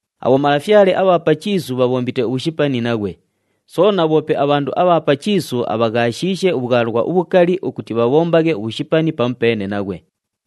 Abhomalafyale abha pa chiisu bhabhombite ubhushipani naghwe, soona bhoope abhandu abha pa chiisu abhaghaashishe ubhwalwa ubhukali ukuti bhabhombaghe ubhushipani pamupeene naghwe.”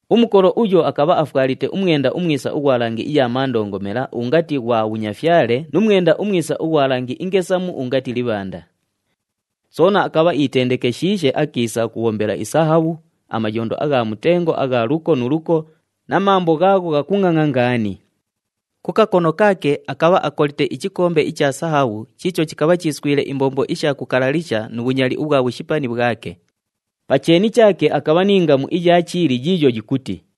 Umukolo uyo akabha afwalite umwenda umwisa ughwa langi iya mandongomela ungati ghwa bhunyafyale nu mwenda umwisa ughwa langi ingesamu ungati libhanda. Soona akabha iitendekeshiishe akiisa ukubhombela isahabhu, amayondo agha mutengo agha luko nu luko na mambo ghaagho ghakungʼangʼa ngaani. Ku kakono kaake akabha akolite ichikombe icha sahabhu chiicho chikabha chiiswile imbombo isha kukalalisha nu bhunyali ubhwa bhushipani bhwake. Pa cheeni chaake akabha ni ngamu iya chiili yiiyo yikuti,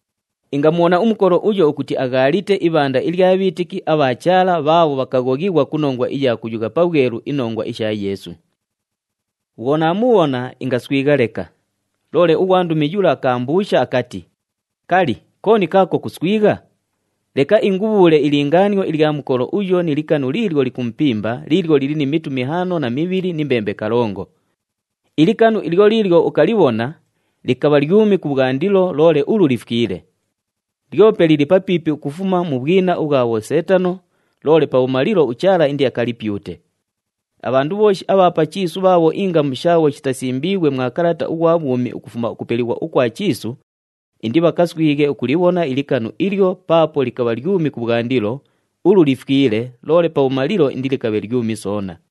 Ingamubhona umukolo uyo ukuti aghaalite ibhanda ilya bhiitiki abha Chaala bhaabho bhakaghoghighwa ku nongwa iya kuyugha pabhwelu inongwa isha Yeesu. Bhwo naamubhona, ingaswigha leka. Loole ughwandumi yula akaambuusha akati, “Kali, kooni kaako kuswigha? Leka ingubhuule ilingaanio ilya mukolo uyo ni likanu liilyo likumupimba liilyo lili ni mitu mihaano na mibhili ni mbembe kalongo. Ilikanu ilyo liilyo ukalibhona, likabha lyumi kubhwandilo loole ulu lifwile. Lyope lili papiipi ukufuma mu bhwina ubhwa bhoseetano, loole pabhumalilo uChaala indiakalipyute. Abhandu bhooshi abha pa chiisu bhaabho ingamu shaabho shitasimbiighwe mwa kalata ughwa bhwumi ukufuma ukupelighwa ukwa chiisu, indibhakaswighe ukulibhona ilikanu ilyo paapo likabha lyumi kubhwandilo, ulu lifwile loole pabhumalilo indilikabhe lyumi soona.”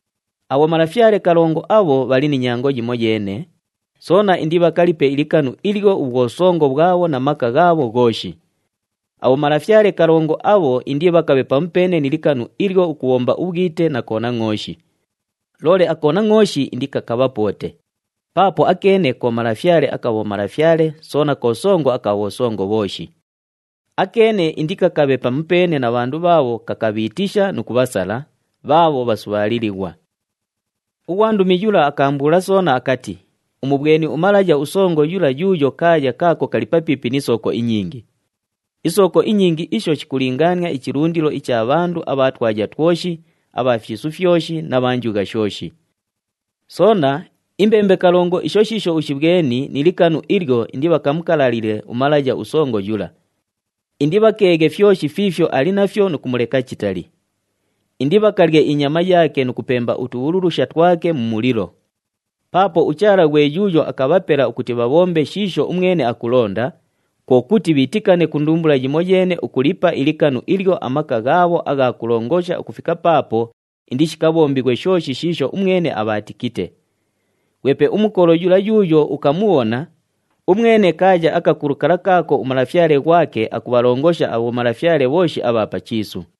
Abhomalafyale kalongo abho bhali ni nyango yimoyeene, soona indibhakalipe ilikanu ilyo ubhwosongo bhwabho na maka ghaabho ghooshi. Abhomalafyale kalongo abho indibhakabhe pamupeene ni likanu ilyo ukubhomba ubhwite na Konangʼooshi. Loole aKonangʼooshi indikakabhapoote, paapo akeene ko Malafyale aka bhomalafyale soona ko Songo aka bhosongo bhooshi. Akeene indikakabhe pamupeene na bhandu bhaabho kakabhiitisha nu kubhasala, bhaabho bhasubhaalilighwa.” Ughwandumi yula akaambuula soona akati, “Umubhweni umalaya usongo yula yuuyo kaaya kaako kali papiipi ni sooko inyingi. Isooko inyingi isho shikulingaania ichilundilo icha bhandu abha twaya twoshi, abha fyisu fyoshi na bha njugha shooshi. “Soona, imbembe kalongo isho shiisho ushibhweni ni likanu ilyo indibhakamukalalile umalaya usongo yula. Indibhakeeghe fyoshi fiifyo ali nafyo nu kumuleka chitali. Indibhakalye inyama yaake nu kupemba utubhululusha twake mu mulilo. Paapo uChaala ghwe yuuyo akabhapela ukuti bhabhombe shiisho umwene akulonda, kwo kuti bhiitikane ku ndumbula yimoyeene ukulipa ilikanu ilyo amaka ghaabho agha kulongosha ukufika paapo indishikabhombighwe shooshi shiisho umwene abhaatikite. Ghwepe umukolo yula yuuyo ukamubhona, umwene kaaya akakulu kala kaako umalafyale ghwake akubhalongosha abhomalafyale bhooshi abha pa chiisu.”